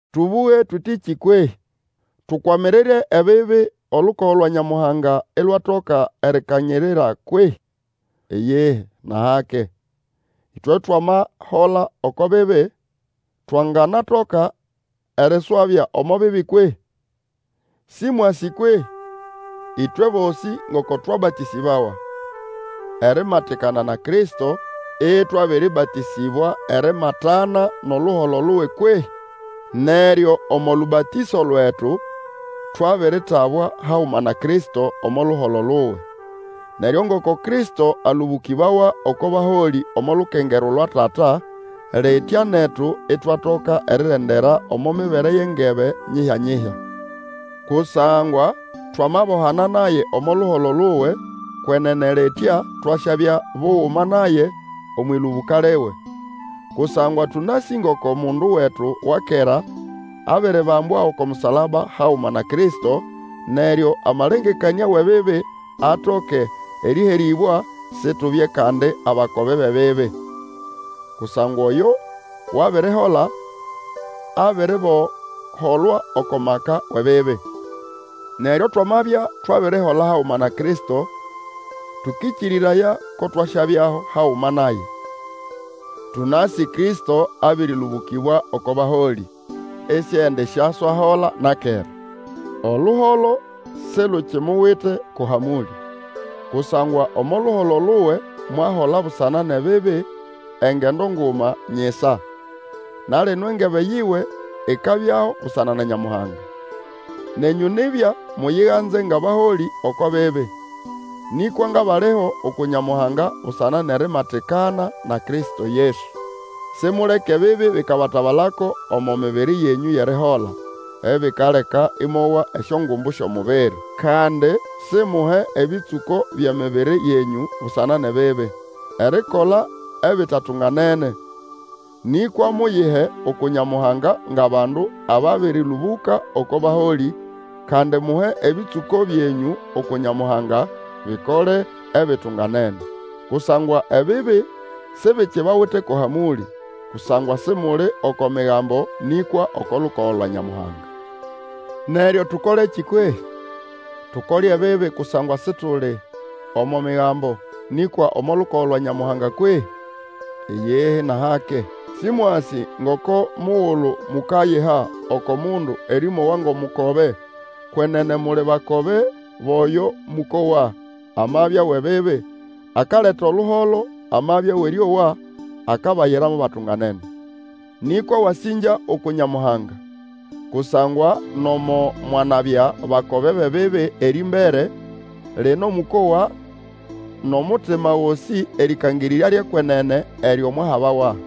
Tũbũge tũtĩkĩ kwehĩ? Tukwamirire ebibi, olukogo lwa Nyamuhanga ilwatoka erikanyirira kwehĩ? Iyihi nʼahake. Ĩtwe twamahola oko bibi, twanganatoka eriswabya omo bibi kwehĩ? Sĩmwasĩ kwehĩ? ĩtwe bosĩ ngoko twabatĩsĩbawa erimatikana na Kristo ĩtwabĩrĩbatĩsĩbwa erimatana nʼoluholo luwe kwehĩ? Neryo omo lũbatĩso lwetu twabiritabwa haguma na Kristo omo luholo luwe, neryo ngoko Kristo alũbũkĩbawa oko baholĩ omo lukengerwa lwa Tata, litya netu itwatoka erirendera omo mibere yʼengebe nyihyanyihya. Kusangwa twamabohana naye omo luholo luwe, kwenene litya twasyabya buguma naye omwʼĩlũbũka liwe, kusangwa tũnasĩ ngoko mundu wetu wa kera abiribambwa oko musalaba haguma na Kristo, neryo amalengekanĩa wʼebibi atoke erĩherĩbwa, situbye kandi abakobe bʼebibi. Kusangwa oyo wabirihola, abiriboholwa oko maka wʼebibi. Neryo twamabya twabirihola haguma na Kristo, tũkĩkĩrĩraya ko twasyabyaho haguma naye. Tũnasĩ Kristo abĩrĩlũbũkĩbwa oko baholĩ, isiendisyaswahola na kera; oluholo silukimuwite ko hamũlĩ. Kusangwa omo luholo luwe, mwahola busana nʼebibi engendo nguma nyisa; na lino engebe yiwe ikabyaho busana na Nyamuhanga. Nenyũ nibya muyiganze ngʼabaholĩ oko bibi, nĩkwa ngʼabaliho uku Nyamuhanga busana nʼerimatikana na Kristo Yesu. Simuleke ebibi bikabatabalako omo mibiri yenyũ yʼerihola, ebikaleka mwowa esyongumbu syʼomubiri. Kandi simuhe ebĩtsũko byʼemibiri yenyũ busana nʼebibi, erikola ebitatunganene; nĩkwa muyihe uku Nyamuhanga ngʼabandu ababĩrĩlũbũka oko baholĩ, kandi muhe ebĩtsũko byenyũ uku Nyamuhanga, bikole ebitunganene. Kusangwa ebibi sibikibawite ko hamũlĩ, kusangwa Simuli oko Migambo nĩkwa oko lukogo lwa Nyamuhanga. Neryo, tũkolekĩ kwehĩ? Tukole ebibi kusangwa Situli omo Migambo, nĩkwa omo lukogo lwa Nyamuhanga kwehĩ? Iyihi, nʼahake! Sĩmwasĩ ngoko mugulu mukayiha oko mundu erĩmowa ngʼomukobe, kwenene muli bakobe bʼoyo mũkowa, amabya wʼebibi, akaleta oluholo, amabya wʼerĩowa, akabayira mo batunganene. Nĩkwa wasĩngya uku Nyamuhanga, kusangwa nomo mwanabya bakobe bʼebibi erĩmbere, lino mũkowa nʼomutima gosĩ erĩkangĩrĩrya lyʼekwenene eryo mwahabawa.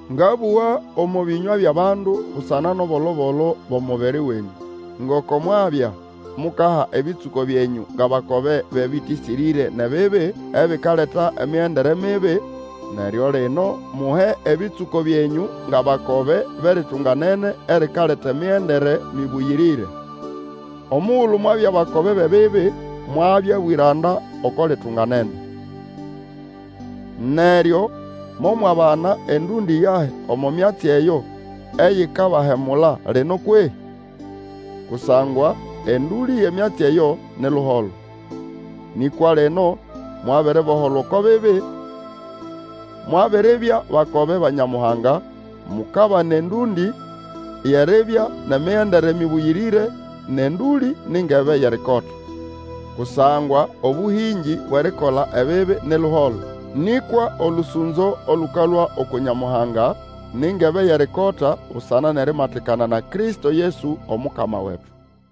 Ngabũga omo bĩnywa byʼabandu busana nʼobolo-bolo bwʼomubiri wenyũ. Ngoko mwabya mukaha ebĩtsũko byenyũ ngʼabakobe bʼebĩtĩsĩrĩre nʼebibi, ebikaleta emigendere mibi, neryo lino muhe ebĩtsũko byenyũ ngʼabakobe bʼeritunganene erikaleta emigendere mĩbũyĩrĩre. Omugulu mwabya bakobe bʼebibi, mwabya bwĩranda oko litunganene. Neryo momwabana endũndĩ yahi omo myatsi eyo eyikabahemula lino kwehĩ? Kusangwa endũlĩ yʼemyatsi eyo ni luholo. Nĩkwa lino mwabiriboholwa oko bibi, mwabiribya bakobe ba Nyamuhanga, mukabana endũndĩ yʼeribya nʼemigendere mĩbũyĩrĩre, nʼendũlĩ ni ngebe yʼerikota. Kusangwa obũhĩngĩ bwʼerikola ebibi ni luholo, nĩkwa olũsũnzo olũkalũa uku Nyamuhanga ni ngebe yʼerikota busana nʼerimatikana na Kristo Yesu, Omukama wetu.